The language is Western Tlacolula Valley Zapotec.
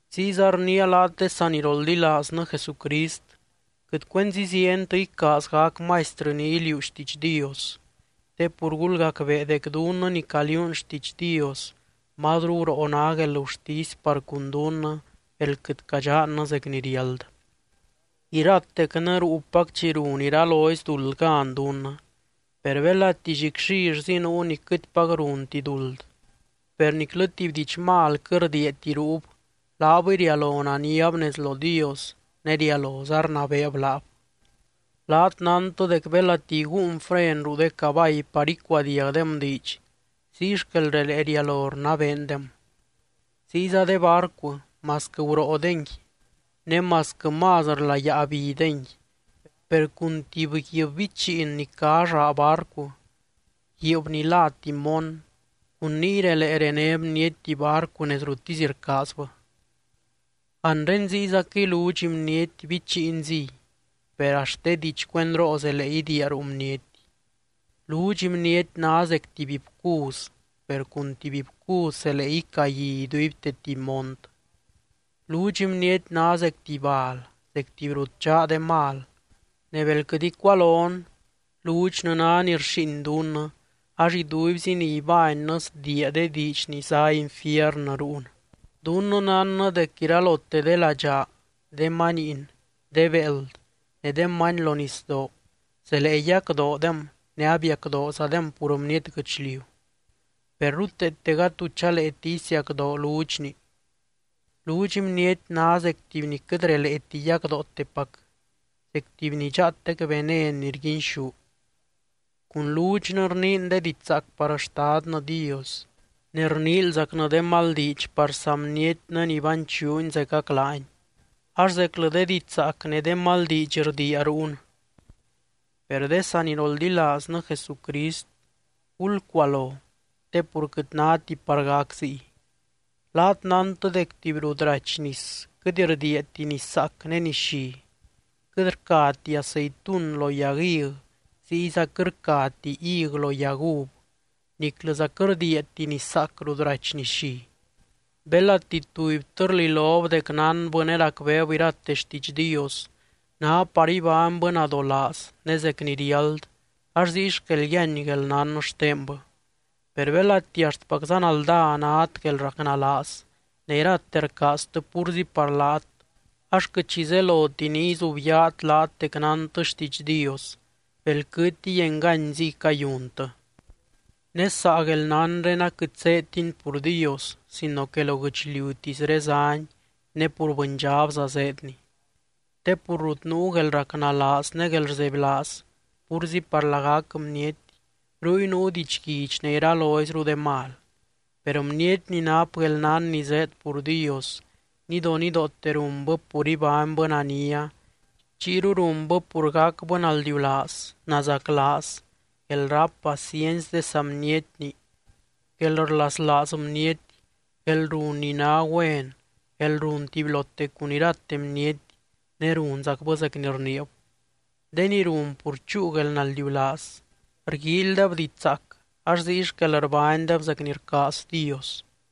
Ziyza rniia laat de saniroldilaaznɨ Jesucrist, quɨt cuenzi zientɨ icaaz gac maistrɨ ni iliuu xtiidx Dios. Te pur gulgacbee dec dunnɨ ni caliuun xtiidx Dios, mazru guroo ná guelgurtisy par cun dunnɨ bel quɨt cadxannɨ zec ni riáld. Iratecnɨ ruupac chi run iralozy duld gan dunnɨ. Per belati llicllillzi nuu ni quɨtpac runti duld, per niclɨ tuby diidx mal quɨt rdiiati ruub, laabɨy rialo naniab nez lo Dios ne rialoza rnabeeb laab. Laat nántɨ dec belati iguun fren ruu de cabay par icuadiagdem diidx, ziy xquel relee rialo rnabeendem. Ziyza de barcu, masquɨ guroodengui ne masquɨ más rlayáa bidengui, per cun tuby guiib bichiin ni cá llaa barcu, guiib ni lá timón, cun niy relee rené bniety tuby barcu nez ruttisy rcaazbɨ. Anre ziyzaquɨy ludxy bniety bichiinziy, per axt de diidx cuendroo zelee idiia ruu bniety. Ludxy bniety ná zec tuby bcuz, per cun tuby bcuz zelee icagui iduibte tuby mont. Ludxy bniety ná zec tuby bal, zec tuby rut dxaa de mal, ne bel quɨt icualon, ludxnɨ ná ni rxíin dunnɨ ax iduibzi ni ibánnɨ sdiia de diidx ni zá infiernɨ rúun. Dunnɨ nánnɨ dec iralote de ladxaa, de maniin, de béeld, ne de many lo nisdoo zelee yacdoodem ne abiacdoozadem pur bniety guɨchliu. Per ruteete gady tu chaleeti isiacdoo ludxni. Ludxy bniety ná zec tuby ni quɨt releeti yacdootepac, zec tuby ni dxaatec venen ni rguinxú. Cun ludxnɨ rniin de diidx zaac par Xtadnɨ Dios, ne rniilzacnɨ de mal diidx par saa bnietnɨ ni banchuuny zecac laany. Ax zeclɨ de diidx zaac ne de mal diidx rdiia rúun. Per de saniroldilaaznɨ Jesucrist, gulcualo, te pur quɨt náti par gac ziy. Laat nántɨ dec tuby rut rachy nis quɨt rdiiati niszaac ne nislli. Quɨt rcati aceitun lo yag hig ziyza quɨt rcati hig lo yag uv, niclɨza quɨt rdiiati niszaac rut rachy nislli. Belati tubytɨ rlilob dec nánbɨ ne racbeeb irate xtiidx Dios, ná par ibánybɨ nadolaaz ne zec ni riáld ax ziy xquel yíany guelnán xtenbɨ. Per belati axtpacza naldá nát guelracnalaaz ne irate rcaaztɨ púrzi par laat, ax quɨt xi zeloti ni izubyaat laat dec nántɨ xtiidx Dios, belquɨtiy enganyziy cayuntɨ. Ne saa guelnánre aquɨt zéedtini pur Dios sino que lo guɨchliutisré záni, ne pur bɨndxabza zéedni. Te pur rut nuu guelracnalaaz ne guelrzebylaaz púrzi par lagac bniety, ruy nuu didxguidx ne iraloizru de mal. Per bniety ni nap guelnán ni zéed pur Dios, nidonidoote runbɨ pur ibánybɨ nania, chiyru runbɨ pur gacbɨ naldiulaaz, nazaclaaz, guelráp paciency de saa bnietni, guelrlaslaaz bniety, guelrun ni ná güen, guelrun tubylote cun irate bniety, ne runzacbɨ zec ni rniib. De ni run pur chúu guelnaldiulaaz, rguíilydeb diidx zaac ax ziy xquel rbánydeb zec ni rcaaz Dios.